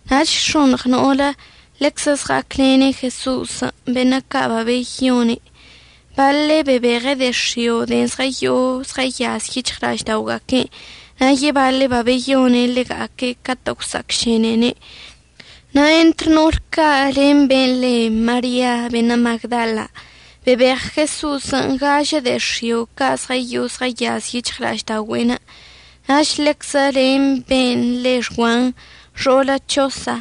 Nach x̱oṉɉ no'olə ḻeczə zɉa'aclene' Jeso'osən', beṉə' ca' babeyone'. Baḻe' babebeɉe' de'e x̱io' de'en zɉəyo'o zɉəyaz yic̱hɉla'aždaoga'aque'enə', na' yebaḻe' babeyone' ḻega'aque' catə' gwsa'acšenene'. Na' entr no'ol ca' len ben' le Maria beṉə' Magdala, bebeɉ Jeso'osən' gažə de'e x̱io' ca' zɉəyo'o zɉəyaz yic̱hɉla'aždaogüe'enə'. Nach ḻeczə len ben' le Xguan, xo'olə Chosa.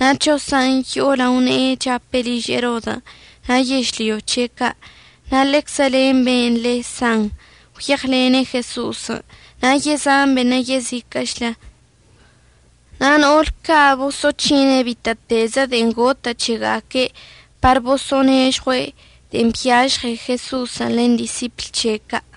Na' Chosan' yo'o lao ne'e chape' liž Erodən' na' yežlyo c̱he' ca'. Na' ḻeczə len ben' le San gwyeɉlene' Jeso'osən', na' yezan beṉə' yeziquə'əchlə. Na' no'ol ca' boso'oc̱hine' bitə'ətezə de'en gotə' c̱hega'aque' par bosə'ənežɉue' de'en byažɉe Jeso'osən' len disipl c̱he' ca'.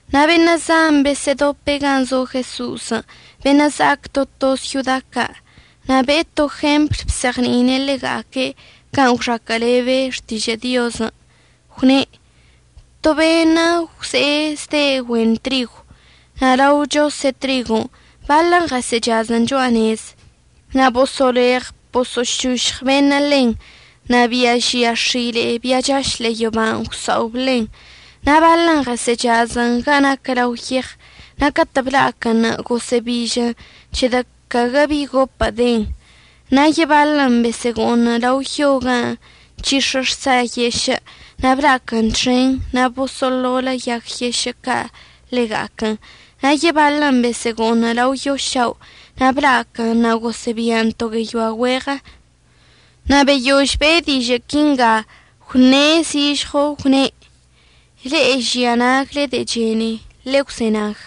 Na' beṉə' zan besə'ədope' gan' zo Jeso'osən' beṉə' za'ac to to syoda ca'. Na' be'e to jempl bzeɉni'ine' ḻega'aque' can' gwxaquə'əlebe xtižə' Diozən'. Gwne': ―To beṉə' gwze'e zde' güen trigw. Na' lao chose' trigon' baḻən ɉəsə'əchazən cho'a nez, na' boso'oleɉ boso'ošošɉ beṉə' ḻen, na' bia žia x̱ile'e bia chaš ḻe'e yoban' gwsa'ob ḻen. Na' baḻən ɉəsə'əchazən ga naquə lao yeɉ, na' catə' bla'aquənṉə' gosə'əbižən c̱hedə' caguə bi gopə' denə'. Na' yebaḻən besə'əgo'oṉən lao yo ga nc̱hix̱ə xsa yešə' na' bla'aquən txen na' boso'oḻolə' yag yešə' ca' ḻega'aquən. Na' yebaḻən besə'əgo'oṉən lao yo šao' na' bla'aquən na' gosə'əbian to gueyoa güeɉə. Na' beyož be'e dižə' quinga gwṉe' zižɉo gwne': ―Le'e žia nagle de'e chene, ḻegwzenag.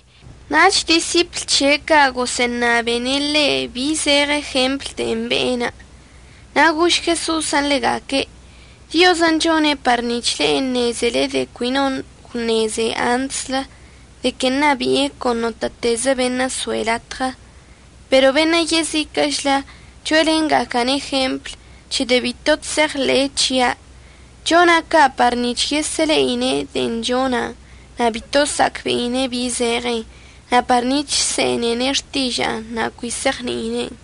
Nach disipl c̱he' ca' gosə'əṉabene' ḻe' bi zeɉe jemplən' de'en be'enə'. Na' gož Jeso'osən' ḻega'aque': ―Diozən' chone' par nic̱h le'e əṉezele de'en cui no gwṉeze antslə de que ṉabi'e con notə'ətezə beṉə' soe' latɉə. Pero beṉə' yeziquə'əchlə cho'elenga'aca'ane' jempl c̱hedə' bito chse'eɉḻe'e c̱hia'. Chona' ca' par nic̱h yesə'əle'ine' de'en chona' na' bito sa'acbe'ine' bi zeɉen, na' par nic̱h əse'enene' xtiža'anə' na' cui se'eɉni'ine'en.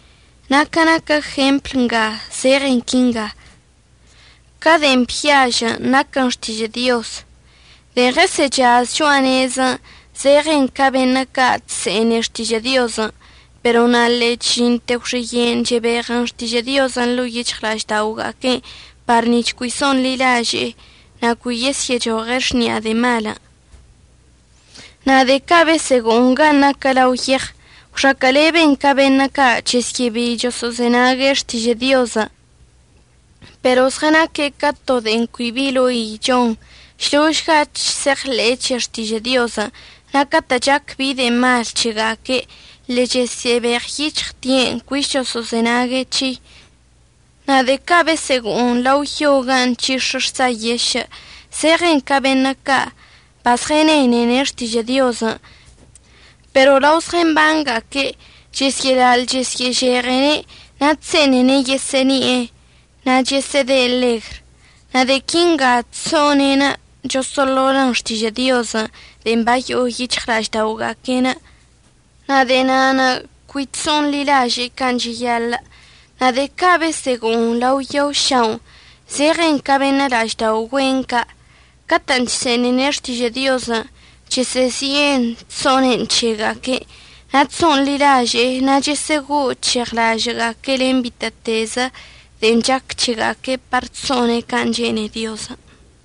Na' ca naquə jempl nga zeɉen quinga: Ca de'en byažən' naquən xtižə' Diozən'. De'en ɉəsə'əchaz cho'a nezən' zeɉen ca beṉə' ca' chse'ene xtižə' Diozən' pero na' ḻe'e chžinte gwxiye'enə' chebeɉən xtižə' Diozən' ḻo'o yic̱hɉla'aždaoga'aque'enə' par nic̱h cui so'onḻilaže'ene' na' cui yesyə'əchoɉe' xni'a de'e malən'. Na' de'e ca' besə'əgo'oṉ gan' naquə lao yeɉ gwxaquə'əleben ca beṉə' ca' chəsyə'əbei choso'ozenag xtižə' Diozən'. Pero zɉənaque' ca to de'e cui bi ḻoi chon, šložga chse'eɉḻe'e c̱he xtižə' Diozən'. Na' catə' chac bi de'e mal c̱hega'aque' ḻe'e chəsə'əbeɉyic̱hɉte'en cuich choso'ozenague' c̱hei. Na' de'e ca' besə'əgo'oṉən lao yo ga nc̱hix̱ə xsa yešə' zeɉen ca beṉə' ca' bazɉənenene' xtižə' Diozən'. Pero lao zɉəmbanga'aque' chesyə'əlaḻ chesyə'əžeɉene', na' chse'enene' yesə'əni'e, na' chəsə'əde' ḻegr. Na' de'e quinga chso'one'enə' choso'oḻolə'ən xtižə' Diozən' de'en bayo'o yic̱hɉla'aždaoga'aque'enə', na' de'e na'anə' cui chso'onḻilaže'ene' can' cheyaḻə'. Na' de'e ca' besə'əgo'oṉən lao yo ša'onə' zeɉen ca beṉə' la'aždao' güen ca' catə'ən chse'enene' xtižə' Diozən' chəsə'əzi'en chso'onen c̱hega'aque'. Na' chso'onḻilaže'ene' na' chesə'əgo'o chesə'əc̱heɉlaže'e len bitə'ətezə de'en chac c̱hega'aque' par chso'one' can' chene'e Diozən'.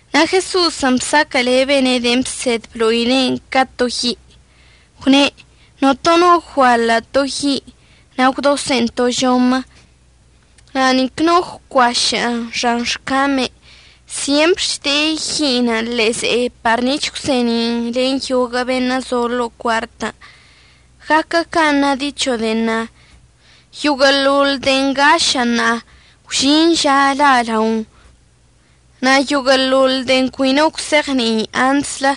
Na' Jeso'osən' bsaquə'əlebene' de'en bsed əblo'ine'enə' ca to yi', gwne': ―Notono no guaḻə' to yi' na' gwdose'en to žomə na' nic no gwcuašə'ən xan xcamei. Syempr chde'e yi'inə' ḻe'e ze'e par nic̱h əgwse'eni'in len yoguə' beṉə' so'o lo'o cuartən'. Guaquə can' na dicho de'en na: “Yoguə'əḻoḻ de'en ngašə' ṉa'a, gwžin ža la'alaon, na' yoguə'əḻoḻ de'en cui no gwse'eɉni'i antslə,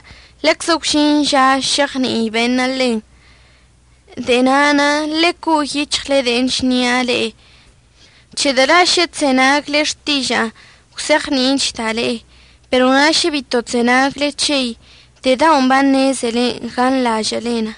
leczə gwžin ža se'eɉni'i beṉə' ḻen.” De'e na'anə' ḻe'e co'o yic̱hɉle de'en chnia' le'e, c̱hedə' la' šə chzenagle xtiža'anə' əgwzeɉni'ichda' le'e. Pero na' šə bito chzenagle c̱hei, de'e daon' baṉezele ganḻažə'əlen.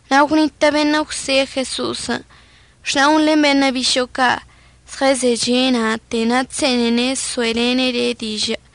Na' gwnitə' beṉə' gwse'e Jeso'osən': ―Xna'on len beṉə' bišo'o ca' zɉəzeche' na'ate, na' chse'enene' əso'elene' le' dižə'.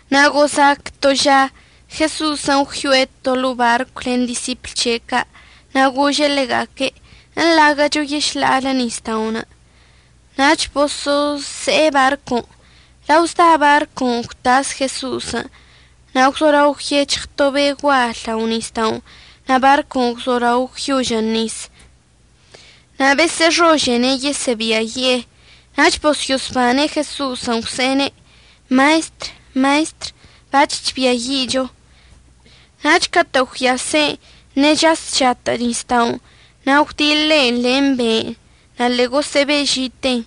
Na' gozac to ža Jeso'osən' gwyo'e to ḻo'o barcw len disipl c̱he' ca', na' gože' ḻega'aque': ―Eḻaguə'əcho yešḻa'alə nisda'onə'. Nach boso'ose'e barcon'. Lao zda barcon' gwtas Jeso'osən'. Na' gwzolao gwyec̱hɉ to be' gual lao nisda'onə' na' barcon' gwzolao gwyožən nisən' na' besə'əxožene' yesə'əbiayi'e. Nach bosyo'osbane' Jeso'osən' gwse'ene': ―¡Maestr! ¡Maestr! ¡Bac̱h chbiayi'icho! Nach catə' gwyase' ṉe'e chas chatə' nisda'onə' na' gwdiḻe'en len be'enə', na' ḻe'e gosə'əbe'ežiten.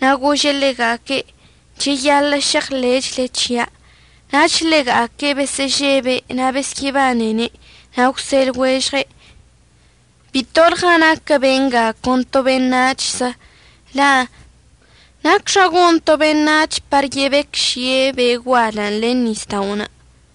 Na' gože' ḻega'aque': ―Cheyaḻə' šeɉḻe'echle c̱hia'. Nach ḻega'aque' besə'əžebe' na' besyə'əbanene' na' gwse' lɉuežɉe': ―Bitolɉa naquə benga con to beṉac̱hzə, la' ¿nacxa gon to beṉac̱h par yebecžie' be' gualən' len nisda'onə'.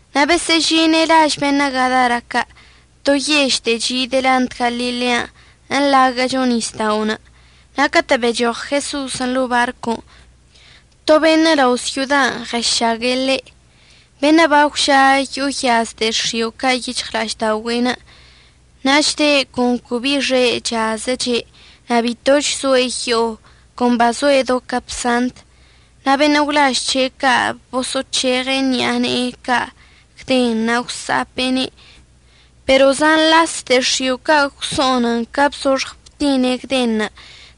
Na' besə'əžine' laž beṉə' Gadara ca', to yež de'e chi' delant Galilean' əḻaguə'əcho nisda'onə'. Na' catə' bechoɉ Jeso'osən' ḻo'o barcon', to beṉə' lao' syodan' ɉəšague' le', beṉə' bagwža yo'o yaz de'e x̱io' ca' yic̱hɉla'aždaogüe'en. Na' chde' con cui bi bi xe' chazəche', na' bitoch zoe' yo'o, con bazoe' do capsant. Na' beṉə' gwlaž c̱he' ca' boso'oc̱heɉe' ṉi'a ne'e ca gden na' gwsa'ape'ene', pero zan las de'e x̱io' ca' gwso'onən ca bzoxɉ btine' gdenṉə'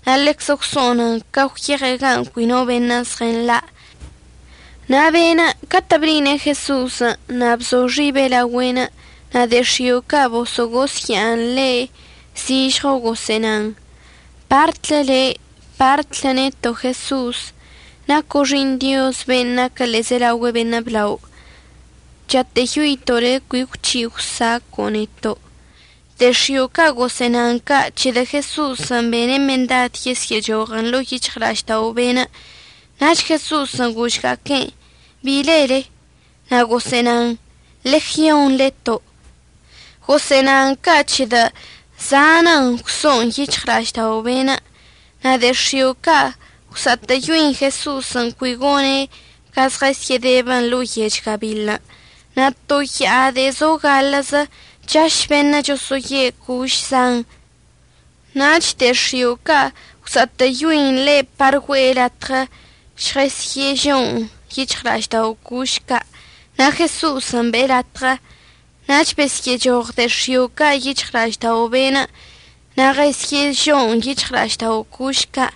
na' ḻeczə gwso'onən ca gwyeɉe' gan' cui no beṉə' zɉənḻa'. Na' be'enə' catə' ble'ine' Jeso'osən' na' bzo xibe' laogüe'enə' na' de'e x̱io' ca' boso'ogosya'an ḻe', zižɉo gosə'ənan: ―Partlə le', partlə neto', Jeso'os. Naco' Xi'iṉ Dioz ben' naquə ḻe'ezelaogüe beṉə' blao. Chatə'əyoito' le' cui əgwc̱hi' əgwsaco'o neto'. De'e x̱io' ca' gosə'ənan ca' c̱hedə' Jeso'osən' bene' mendad yesyə'əchoɉən ḻo'o yic̱hɉla'aždao' be'enə'. Nach Jeso'osən' gožga'aquen': ―¿Bi lele? Na' gosə'ənan: ―Legion leto'. Gosə'ənan ca' c̱hedə' zanən gwso'on yic̱hɉla'aždao' be'en'. Na' de'e x̱io' ca' gwsa'atə'əyoin Jeso'osən' cui gone' ca žɉəsyə'ədebən ḻo'o yech gabiḻən'. Na' to ya'a de'e zo gaḻə'əzə chaš beṉə' choso'oye' coš zan. Nach de'e x̱io' ca' gwsa'atə'əyoin ḻe' par güe'e latɉə žɉesyə'əžo'on yic̱hɉla'aždao' coš ca'. Na' Jeso'osən' be'e latɉə. Nach besyə'əchoɉ de'e x̱io' ca' yic̱hɉla'aždao' be'enə' na' ɉəsyə'əžo'on yic̱hɉla'aždao' coš ca'.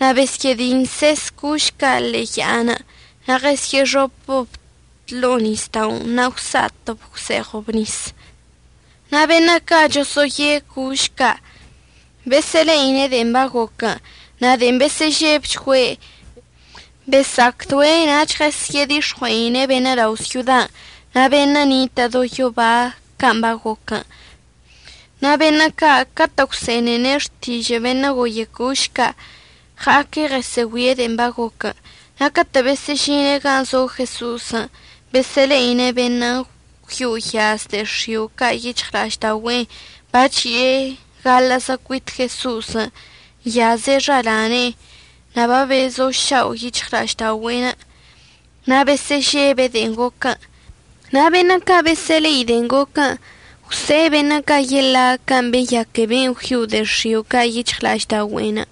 Na' besyə'ədinses coš ca' ḻe'e ya'anə' na' ɉesyə'əxopəb ḻo'o nisda'onə', na' gwsa'atəb gwse'eɉəb nisən'. Na' beṉə' ca' choso'oye coš ca' besə'əle'ine' de'en bagoquən' na' de'en besə'əžebchgüe' besa'acdoe' nach ɉesyə'ədix̱ɉue'ine' beṉə' lao' syodan', na' beṉə' nitə' do yoba can' bagoquən'. Na' beṉə' ca' catə' gwse'enene' xtižə' beṉə' goye coš ca' ɉa'aque' ɉəsə'əgüie' de'en bagoquən'. Na' catə' besə'əžine' gan' zo Jeso'osən', besə'əle'ine' be'enə' gwyo'o gwyaz de'e x̱io' ca' yic̱hɉla'aždaogüe'enə' bachi'e gaḻə'əzə cuit Jeso'osən', nyaz xalane'e, na' babezošao' yic̱hɉla'aždaogüe'enə'. Na' besə'əžebe' de'en goquən'. Na' beṉə' ca' besə'əle'i de'en goquən' gwse'e beṉə' ca' yeḻa' can' beyaque ben' gwyo'o de'e x̱io' ca' yic̱hɉla'aždaogüe'enə'.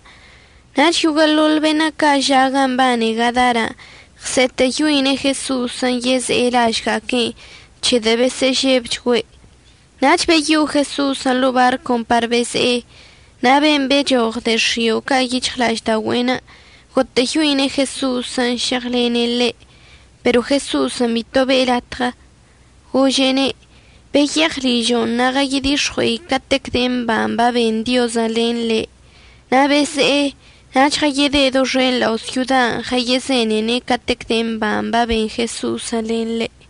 Nach yoguə'əḻoḻ beṉə' ca' ža' gan' mbane Gadaran' ɉse'etə'əyoine' Jeso'osən' yeze'e lažga'aque'enə' c̱hedə' besə'əžebchgüe'. Nach beyo'o Jeso'osən' ḻo'o barcon' par beze'e. Na' ben' bechoɉ de'e x̱io' ca' yic̱hɉla'aždaogüe'enə' gotə'əyoine' Jeso'osən' šeɉlene' ḻe', pero Jeso'osən' bito be'e latɉə, gože'ene': ―Beyeɉ ližo' na' ɉəyedix̱ɉue'e catec de'e mban' baben Diozən' len le'. Na' beze'e, nach ɉəyede' doxen lao syodan' ɉəyezenene' catec de'e mban' baben Jeso'osən' len le'.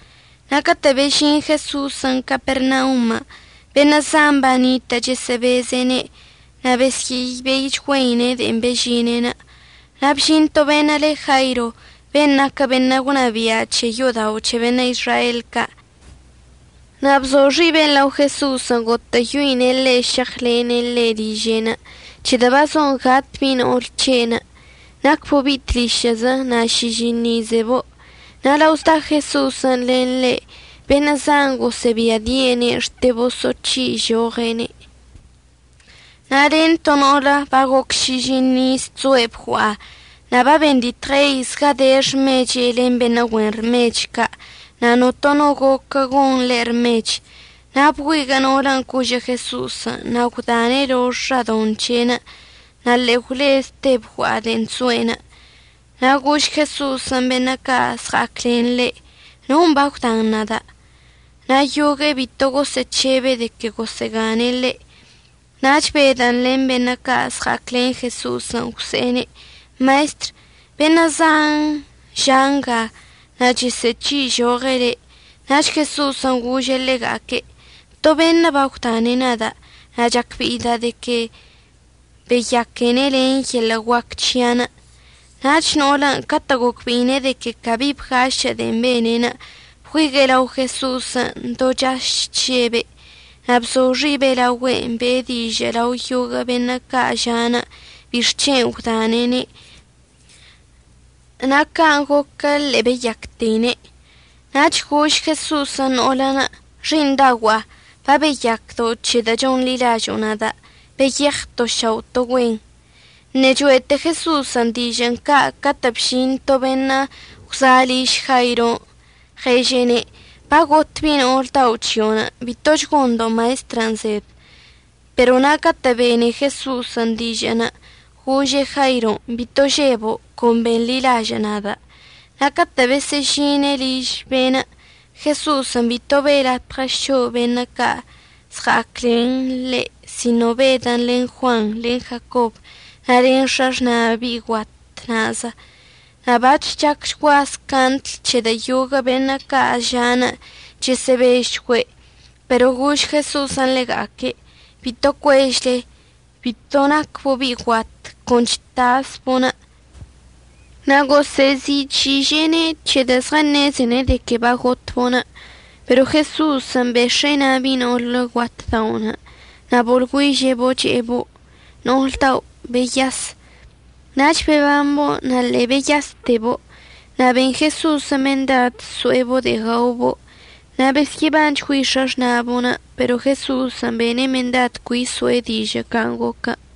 Na' catə' bežin Jeso'osən' Capernaunṉə' beṉə' zan banitə' chəsə'əbeze'ene' na' besyə'əbeichgüeine' de'e bežine'enə'. Na' bžin to beṉə' le Jairo, ben' naquə beṉə' gwnabia' c̱he yo'odao' c̱he beṉə' Izrael ca'. Na' bzo xibe' lao Jeso'osən' gotə'əyoine' ḻe' šeɉlene' ḻe' liže'enə' c̱hedə' bazon gat bi'i no'ol c̱he'enə'. Nacbo' bi'i tlišə'əzə na' šižiṉ izgueibo'. Na' lao zda Jeso'osən' len ḻe', beṉə' zan gosə'əbiadi'ene' xte boso'oc̱hi'ižoɉene'. Na' len to no'olə bagoc šižiṉ iz chzoe' bgua'a na' babenditɉei zgade xmechen' len beṉə' güen rmech ca'. Na' notono goquə gon ḻe' rmech. Na' bgüiguə' no'olən' cožə' Jeso'osən' na' gwdane' lox xadoṉ c̱he'enə', na' ḻe'e gwlezte bgua'a de'en chzo'enə'. Na' gož Jeso'osən' beṉə' ca' zɉa'aclen ḻe': ―¿Non' bagwdan nada'? Na' yogue'e bito gosə'əc̱hebe' de que gosə'əgane' ḻe'. Nach Bedən' len beṉə' ca' zɉa'aclen Jeso'osən' gwse'ene': ―Maestr, beṉə' zan ža' nga, na' chesə'əc̱hi'ižoɉe' le'. Nach Jeso'osən' gože' ḻega'aque': ―To beṉə' bagwdane' nada'. Na' chacbe'ida' de que beyaquene' len yeḻə' guac c̱hia'anə'. Nach no'olən' catə' gocbe'ine' de que cabi bgašə' de'en bene'enə', bgüigue'e lao Jeso'osən' do chaž chžebe', na' bzo xibe' laogüe'enə' be'e dižə' lao yoguə' beṉə' ca' ža'anə' bixc̱hen' gwdane'ene' na' can' goquə ḻe'e beyacteine'. Nach gož Jeso'osən' no'olən': ―Xi'iṉdaogua'a, babeyacdo' c̱hedə' chonḻilažo'o nada'. Beyeɉ to šao' to güen. Ṉe'e cho'ete Jeso'osən' dižə'ən ca' catə' bžin to beṉə' gwza' liž Jairon' ɉeže'ene': ―Bagot bi'i no'ol dao' c̱hio'onə'. Bitoch gondo' maestrən' zed. Pero na' catə' bene Jeso'osən' dižə'ənə' gože' Jairon': ―Bito žebo'. Con benḻilažə' nada'. Na' catə' besə'əžine' liž be'enə' Jeso'osən' bito be'e latɉə so'o beṉə' ca' zɉa'aclen ḻe' sino Bedən' len Juanṉə' len Jacobən' na' len x̱axna' bi'i guat na'azə. Na' bac̱h chacchgua scaṉdl c̱hedə' yoguə' beṉə' ca' ža'anə' chəsə'əbežchgüe', pero gož Jeso'osən' ḻega'aque': ―Bito cuežle. Bito nacbo' bi'i guat, con chtasbo'onə'. Na' gosə'əzi'ic̱hi'iže'ene' c̱hedə' zɉəṉezene' de que bagotbo'onə'. Pero Jeso'osən' bex̱e'e na' bi'i no'olə guat da'onə' na' boḻgüiže'ebo' che'ebo': ―No'ol dao' beyas. Nach bebambo' na' ḻe'e beyastebo'. Na' ben Jeso'osən' mendadən' əso'ebo' de'e gaobo'. Na' besyə'əbanchgüei x̱axna'abo'on, pero Jeso'osən' bene' mendad cui əso'e dižə' can' goquən'.